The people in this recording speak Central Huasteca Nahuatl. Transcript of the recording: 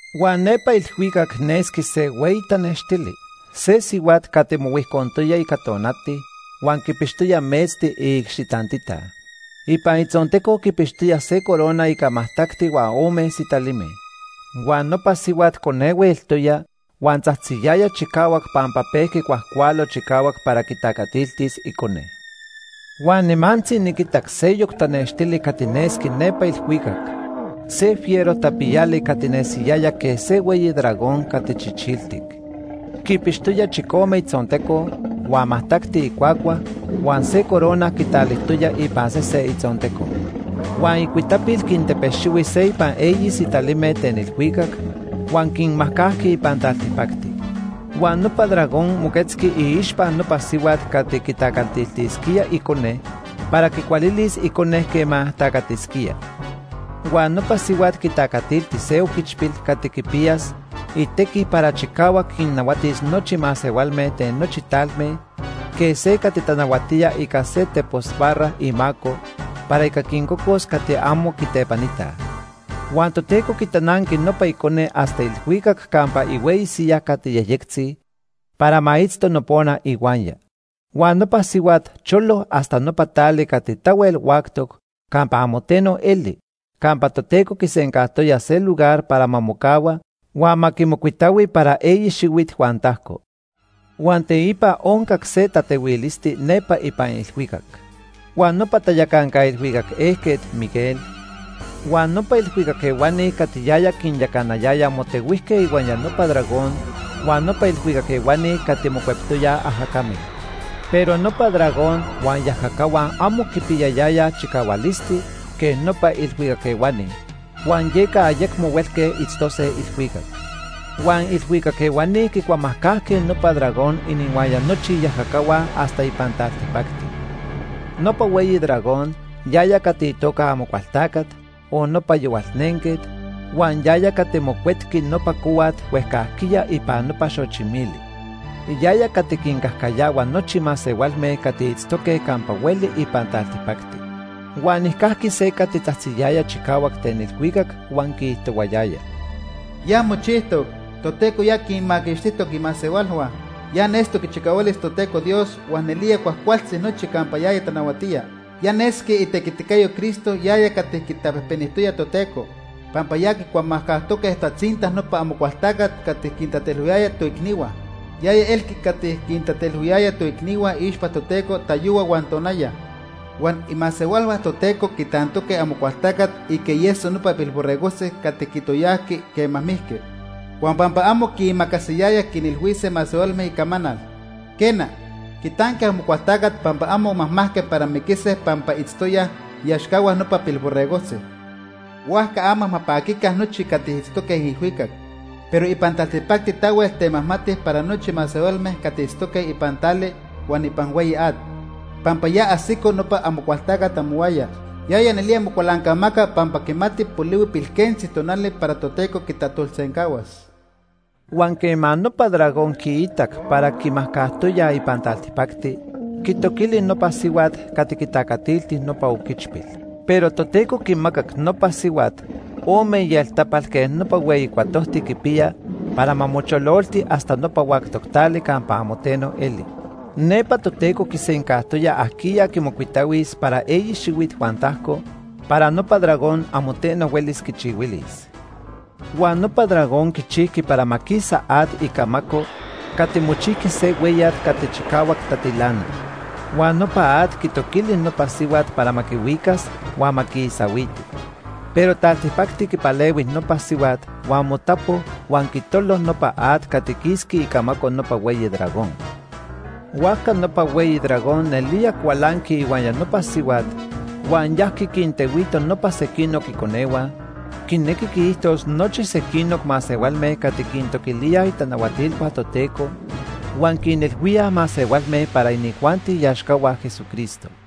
Huan nepa ilhuicac nesqui se hueyi tanextili, se sihuat cati mohuijcontoya ica tonati huan quipixtoya metzti iicxi tantita. Ipan itzonteco quipixtoya se corona ica majtacti huan ome sitalime. Huan nopa sihuat conehue eltoya huan tzajtziyaya chicahuac pampa pejqui cuajcualo chicahuac para quitacatiltis icone. Huan nimantzi niquitac seyoc tanextili cati nesqui nepa ilhuicac, se fiero tapiyali cati nesiyaya quej se hueyi dragón cati chichiltic. Quipixtoya chicome itzonteco, huan majtacti icuacua, huan se corona quitalijtoya ipan sese itzonteco. Huan icuitapil quintepexihui se ipan eyi sitalime ten ilhuicac huan quinmajcajqui ipan taltipacti. Huan nopa dragón moquetzqui iixpa nopa sihuat cati quitacatiltisquía icone para quicualilis icone quema tacatisquía. Huan nopa sihuat quitacatilti se oquichpil cati quipiyas itequi para chicahuac quinnahuatis nochi masehualme ten nochi talme quej se cati tanahuatía ica se tepos barra imaco para ica quincocos cati amo quitepanitaj. Huan Toteco quitananqui nopa icone hasta ilhuicac campa ihueyi siyaj cati yejyectzi para ma itzto nopona ihuaya. Huan nopa sihuat cholo hasta nopa tali cati tahuel huactoc campa amo teno eli campa Toteco quisencajtoya se lugar para ma mocahua huan ma quimocuitahui para eyi xihuit huan tajco. Huan teipa oncac se tatehuilisti nepa ipan ilhuicac. Huan nopa tayacanca ilhuicac ejquet, Miguel, huan nopa ilhuicac ehuani cati yaya quinyacanayaya motehuijque ihuaya nopa dragón huan iilhuicac ehuani cati mocuectoyaj ajacame. Pero nopa dragón huan iajacahua amo quipiyayayaj chicahualisti quej nopa ilhuicac ehuani huan yeca ayecmo huelque itztose ilhuicac. Huan ilhuicac ehuani quicuamajcajque nopa dragón inihuaya nochi iajacahua hasta ipan taltipacti. Nopa hueyi dragón, yaya cati itoca Amocualtacat o nopa Yohualnenquet, huan yaya cati mocuetqui nopa cohuat huejcajquiya ipan nopa xochi mili. Yaya cati quincajcayahua nochi masehualme cati itztoque campa hueli ipan taltipacti. Huan nijcajqui se cati tzajtziyaya chicahuac ten ilhuicac huan quiijtohuayaya: “Ya mochijtoc. Toteco ya quinmaquixtijtoc imasehualhua. Ya nestoc ichicahualis Toteco Dios huan nelía cuajcualtzi nochi campa yaya tanahuatía. Ya nesqui itequiticayo Cristo yaya cati quitapejpenijtoya Toteco, pampa ya quicuamajcajtoque tatzinta nopa Amocualtacat cati quintatelhuiyaya toicnihua. Yaya elqui cati quintatelhuiyaya toicnihua iixpa Toteco tayohua huan tonaya. Huan imasehualhua Toteco quitantoque Amocualtacat ica ieso nopa Pilborregojtzi cati quitoyajqui quema mijqui, huan pampa amo quiimacasiyayaj quinilhuise masehualme icamanal. Quena, quitanque Amocualtacat pampa amo majmajque para miquise pampa itztoyaj iaxcahua nopa Pilborregojtzi. Huajca ama ma paquica nochi cati itztoque ilhuicac. Pero ipan taltipacti tahuel temajmati para nochi masehualme cati itztoque ipan tali huan ipan hueyi at, pampa ya ajsico nopa Amocualtacat amohuaya. Yaya nelía mocualancamaca pampa quimati polihui pilquentzi tonali para Toteco quitajtolsencahuas.” Huan quema nopa dragón quiitac para quimajcajtoyaj ipan taltipacti, quitoquili nopa sihuat cati quitacatilti nopa oquichpil. Pero Toteco quimacac nopa sihuat ome ieltapal quej nopa hueyi cuatojti quipiya para ma mochololti hasta nopa huactoc tali campa amo teno eli. Nepa Toteco quisencajtoya ajquiya quimocuitahuis para eyi xihuit huan tajco para nopa dragón amo teno huelis quichihuilis. Huan nopa dragón quichijqui para ma quisa at icamaco cati mochijqui se hueyat cati chicahuac tatilana. Huan nopa at quitoquili nopa sihuat para ma quihuicas huan ma quiisahuiti. Pero taltipacti quipalehui nopa sihuat huan motapo huan quitolo nopa at cati quisqui icamaco nopa hueyi dragón. Huajca nopa hueyi dragón nelía cualanqui ihuaya nopa sihuat huan yajqui quintehuito nopa sequinoc iconehua, quinequi quiijtos nochi sequinoc masehualme cati quintoquilíaj itanahuatilhua Toteco huan quinilhuíaj masehualme para inijuanti iaxcahua Jesucristo.